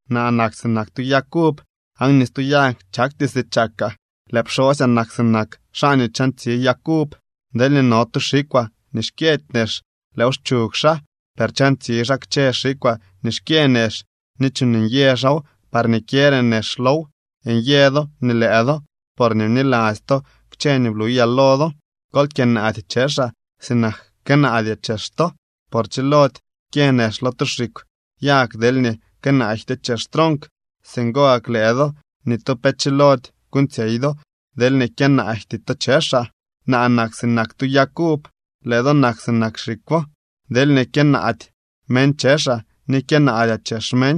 ’Naa nak sinak tu yag uv aan ni stu yag chakty si chakaa. Lëë pxosyaa nak sinak xaa nii chantsi yag uv. Deelñee no tu xikwaa nii xkyëdy nex, lëëw xchug xaa. Per chantsi xaa kchë xikwaa nii xkyë nex ni chuuñ nyë xaaw parñee kyëre nex low. Nyë do nii lëë do, porñee bniladzy to kchë nii bluyaa lo do. Kol kyënaady chexaa sinak kënaadyaa chex to. Por chilody kyë nex lo tu xikw yag deelñee kënaajtyoo chex tronk. Singo gak lëë do, ni tu pe chilody kuuñtsyey do deelñee kyënaajty to chexaa. ’Naa nak sinak tu yag uv. Lëë do nak sinak xikwo. Deelñee kyënaady meñ chexaa ni kyënaadyaa chex meñ,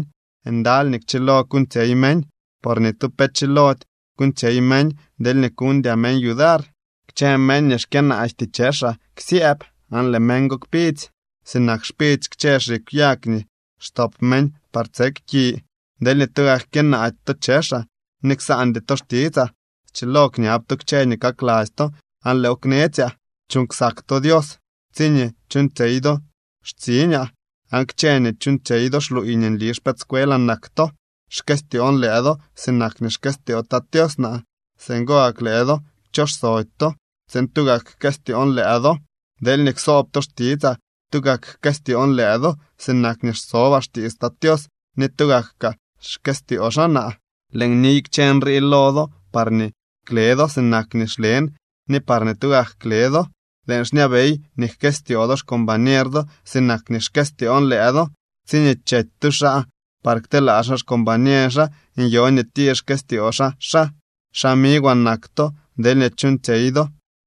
ndaly nii kchilo kuuñtsyey meñ, por ni tu pe chilody kuuñtsyey meñ deelñee kuñdyaa meñ yudar. Kchë meñ nii xkyënaajty chexaa ksyëëb aan lëë meñ go kpidzy sinak xpidzy kchë xikw yag nii xtop meñ par tsek ki. ’Deelñee tugak kyënaady to chexaa ni ksaandy to xtitsaa, schilo kñab to kchë nii kakladzy to aan lëëw knetsyaa. Chuuñ ksak to Tat Tios tsiñee chuuñtsyey do xtsiñaa. Aan kchë nii chuuñtsyey do xluuy nii nli xpëëdscuelaa nak to. Xkëstyoon lëë do sinak nii xkëstyoo Tat Tios naa. Singo gak lëë do kchoxsody to tsiin tugak jkëstyoon lëë do. Deelñee ksoob to xtitsaa, tugak jkëstyoon lëë do, sinak nii xsobaa xtiits Tat Tios ni tugak kaa xkëstyoo xaa naa. ’Lëën niy kchë nrii lo do parñee kle do sinak nii xlen ni parñee tugak kle do. Lëën xñabey nii jkëstyoo do xcombañer do sinak nii xkëstyoon lëë do. Tsiñee chety tu xaa par kteelaa xaa xcombañer xaa nyoo nii tir xkëstyoo xaa xaa. Xamigwaa nak to deelñee chuuñtsyey do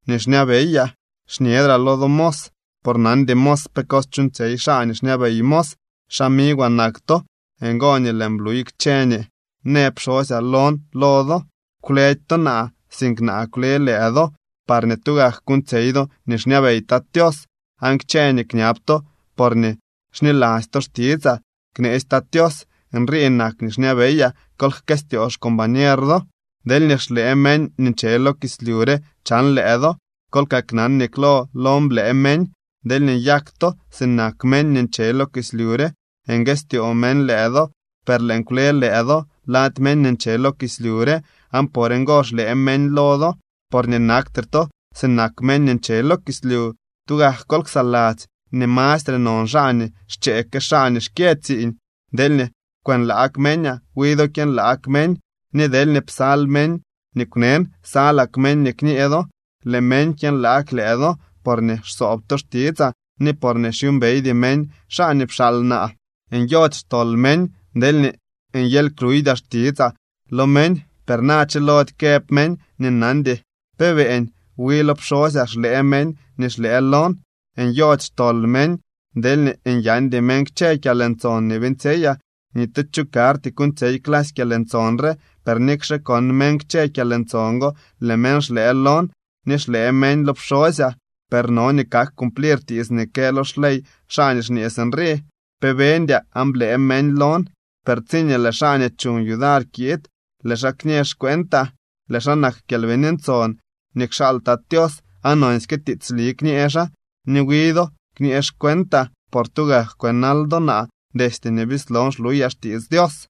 nii xñabeyaa. Xñedraa lo do mos, por nandy mos pe cos chuuñtsyey xaa nii xñabey mos. Xamigwaa nak to. Ngo nii lëën bluy kchë nii në pxosyaa lon lo do. Kwledy to naa, sink naa kwle lëë do parñee tugak kuuñtsyey do nii xñabey Tat Tios. Aan kchë nii kñab to porñee xniladzy to xtitsaa kneetsy Tat Tios. Nrii nak nii xñabeyaa: Kol jkëstyoo xcombañer do. ’Deelñee xlëë meñ nii nche lo kislyu re chan lëë do, kol kaknan nii klo lon blëë meñ. Deelñee nyak to sinak meñ nii nche lo kislyu re, nguëstyoo meñ lëë do. Per lëën kwle lëë do lady meñ nii nche lo kislyu re, aan por ngo xlëë meñ lo do, porñee naktre to sinak meñ nii nche lo kislyu. Tugak kol ksaladzy nii mastre non xaa nii xchee que xaa nii xkyë tsiiñ. Deelñee kwënlaag meñaa, wi do kyënlaag meñ. Ni deelñee psal meñ nii kwnen, salak meñ nii kñee do. Lëë meñ kyënlaag lëë do, porñee xsoob to xtitsaa ni porñee xyuumbeydy meñ xaa nii pxaal naa. ’Nyody xtol meñ deelñee nyely kluuydyaa xtitsaa lo meñ. Per na chilody këb meñ nii nandy pe beeñ. Wi lo pxosyaa xlëë meñ nii xlëë lon. Nyody xtol meñ deelñee nyandy meñ kchë kyalntson nii beeñtsyeyaa. Ni tu cho karty kuuñtsyey clasy kyalntson re. Per nikxe kon meñ kchë kyalntson go, lëë meñ xlëë lon ni xlëë meñ lo pxosyaa. Per no nii kak cumplir tiits nii kë lo xley xaa nii xñee sinrii: “Pe beñdyaa aan blëë meñ lon.” ’Per tsiñee lëë xaa nii chuñ yudar kiid, lëë xaa kñee xcuentaa. Lëë xaa nak Kyalbini Ntson nii kxaal Tat Tios aan nonsyke tiitsli kñee xaa. Ni wi do kñee xcuentaa, por tugak kwënal do naa destye nii bislon xluyaa xtiits Dios.